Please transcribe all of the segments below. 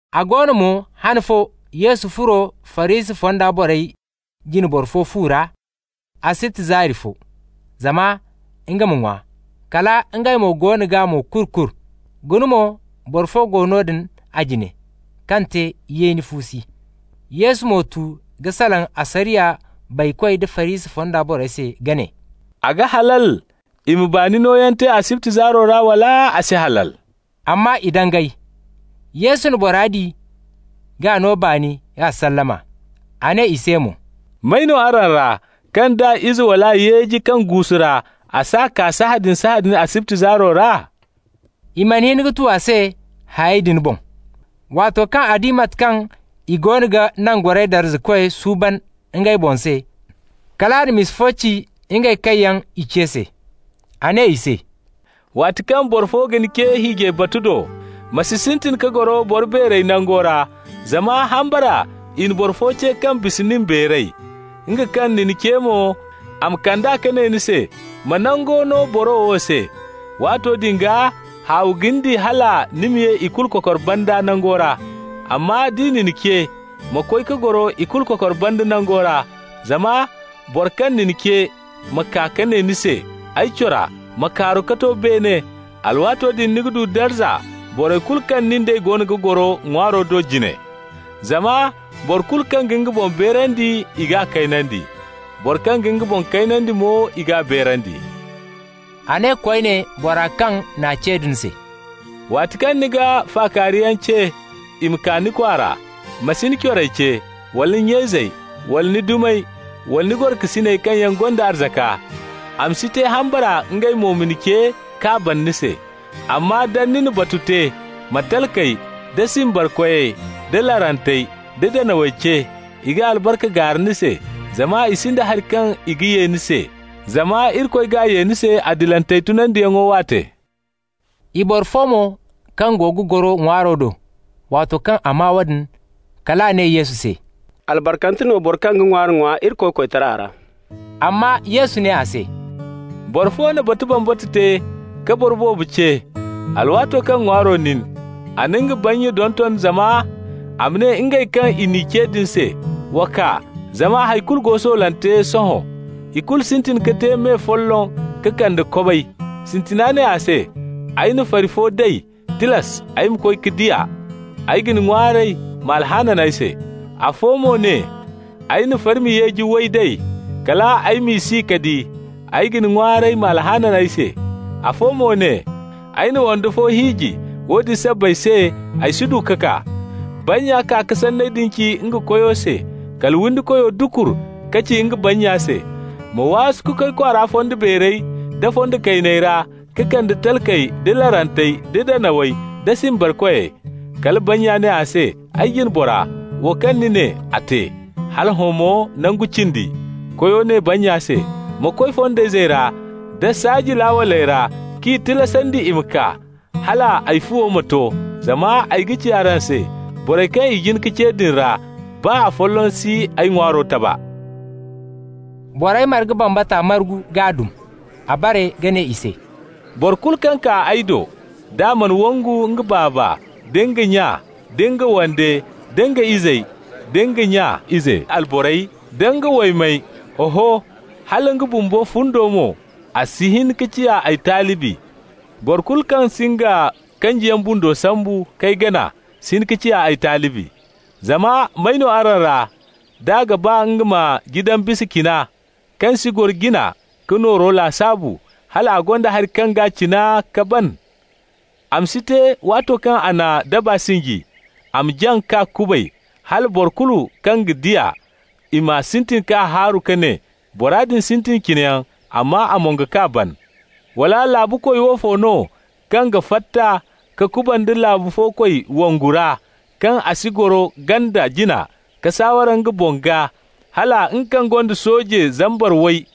A go no mo han fo Yesu furo Farisi fonda borey jine boro fo fu ra, asibti zaari fo, zama nga ma ŋwa. Kala ngey mo goono g'a mo-kuru-kuru. Guna mo, boro fo go noodin a jine kaŋ te yeeni fuusi. Yesu mo tu ka salaŋ asariya baykoy da Farisi fonda borey se ka ne: «A ga halal i ma baani nooyaŋ te asibti zaaro ra, wala a si halal?» Amma i dangay. Yesu na bora di k'a no baani k'a sallama. A ne i se mo: «May no araŋ ra, kaŋ d'a ize wala yeeji kaŋ guusu ra, a s'a kaa sahãadin-sahãadin asibti zaaro ra?» I mana hin ka tu a se hayey din boŋ. Waato kaŋ a di mate kaŋ i goono ga nangoray darzakoyey suuban ngey boŋ se, kal a na misa fo ci ngey kaŋ yaŋ i ce se. A ne i se: «Waati kaŋ boro fo ga ni ce hiijay batu do, ma si sintin ka goro boro beerey nango ra, zama hambara i na boro fo ce kaŋ bisa nin beeray. Nga kaŋ na ni ce mo, a ma kand'a ka ne ni se: ‹Ma nango no boro wo se.› Waato din gaa, haawi ga ni di hala ni ma ye i kulu kokor banda nango ra. Amma d'i na ni ce, ma koy ka goro i kulu kokor banda nango ra, zama boro kaŋ na ni ce ma kaa ka ne ni se: ‹Ay cora, ma kaaru ka to beene.› Alwaato din ni ga du darza borey kulu kaŋ nin d'ey goono ga goro ŋwaaro do jine. Zama boro kulu kaŋ ga nga boŋ beerandi, i g'a kaynandi. Boro kaŋ ga nga boŋ kaynandi mo, i g'a beerandi.» A ne koyne bora kaŋ n'a ce din se: «Waati kaŋ ni ga fakaariyaŋ ce i ma kaa ni kwaara, ma si ni corey ce, wala ni nya-izey, wala ni dumey, wala ni gorokasiney kaŋ yaŋ gonda arzaka. A ma si te hambara ngey mo ma ni ce, k'a bana ni se. Amma, da ni na batu te, ma talkey, da simbarkoy, da larantey, da danawey ce. I ga albarka gaara ni se, zama i sinda hari kaŋ i ga ye ni se. Zama Irikoy g'a ye ni se adilantey tunandiyaŋo waate.» I boro fo mo kaŋ go ga goro ŋwaaro do, waato kaŋ a maa woodin, kal a ne Yesu se: «Albarkante no boro kaŋ ga ŋwaari ŋwa Irikoy koytara ra!» Amma Yesu ne a se: «Boro fo na batu bambata te ka boro boobo ce. Alwaato kaŋ ŋwaaro nin, a na nga bannya donton zama a ma ne ngey kaŋ i n'i ce din se: ‹Wa kaa, zama hay kulu go soolante sohõ.› I kulu sintin ka te me folloŋ ka kande kobay. Sintina ne a se: ‹Ay na fari fo day, tilas ay ma koy ka di a. Ay ga ni ŋwaaray, ma alhaanan ay se.› Afo mo ne: ‹Ay na farmi yeeji way day, kal ay m'i si ka di. Ay ga ni ŋwaaray, ma alhaanan ay se.› Afo mo ne: ‹Ay na wande fo hiiji, woodin sabbay se ay si du ka kaa.› Bannya kaa ka sanney din ci nga koyo se. Kala windikoyo dukur ka ci nga bannya se: ‹Ma waasu ka koy kwaara fondo beerey da fondo kayney ra ka kande talkey da larantey da danawey da simbarkoy.› Kala bannya ne a se: ‹Ay jine bora, wo kaŋ ni ne, a te. Hala hõ mo nangu cindi.› Koyo ne bannya se: ‹Ma koy fondayzey ra nda saaji laawaley ra k'i tilasandi i ma kaa, hal ay fuwo ma to. Zama ay ga ci araŋ se: borey kaŋ i jin ka ce din ra, baa afolloŋ si ay ŋwaaro taba.›» Borey marga bambata margu k'a dum. A bare ka ne i se: «Boro kulu kaŋ kaa ay do, d'a mana wangu nga baaba, da nga nya, da nga wande, da nga izey, da nga nya ize alborey, nda nga waymey, oho, hala nga bumbo fundo mo -- a si hin ka ciya ay talibi. Boro kulu kaŋ si nga kanjiyaŋ bundo sambu k'ay gana si hin ka ciya ay talibi. Zama may no araŋ ra, d'a ga ba nga ma jidan bisa cina, kaŋ si goro jina ka nooro lasaabu, hal a gonda hari kaŋ g'a cina ka ban? A ma si te, waato kaŋ a na daba sinji, a ma jaŋ k'a kubay, hala boro kulu kaŋ ga di a, i ma sintin k'a haaru ka ne: ‹Bora din sintin cinayaŋ, amma a mongo k'a ban.› Wala laabu koy woofo no, kaŋ ga fatta ka kubanda laabu fo koy wongu ra, kaŋ a si goro ganda jina ka saaware nga boŋ gaa, hala nga kaŋ gonda sooje zambar way,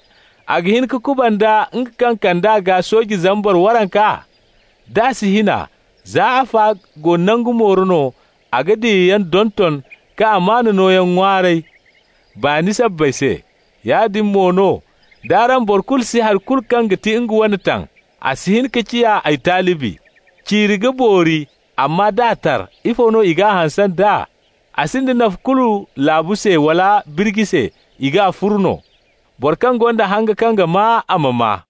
a ga hin ka kubanda nga kaŋ ga kand'a gaa sooje zambar waranka? D'a si hin a, za afa go nangu mooro no, a ga diyayaŋ donton ka amaana nooyaŋ ŋwaaray, baani sabbay se. Yaadin mo no, d'araŋ boro kulu si hari kulu kaŋ ga ti nga wane taŋ, a si hin ka ciya ay talibi. Ciiri ga boori, amma d'a tar, ifo no i g'a hanse nd'a? A sinda nafa kulu laabu se wala birji se. I g'a furu no. Boro kaŋ gonda hanga kaŋ ga maa, a ma maa.»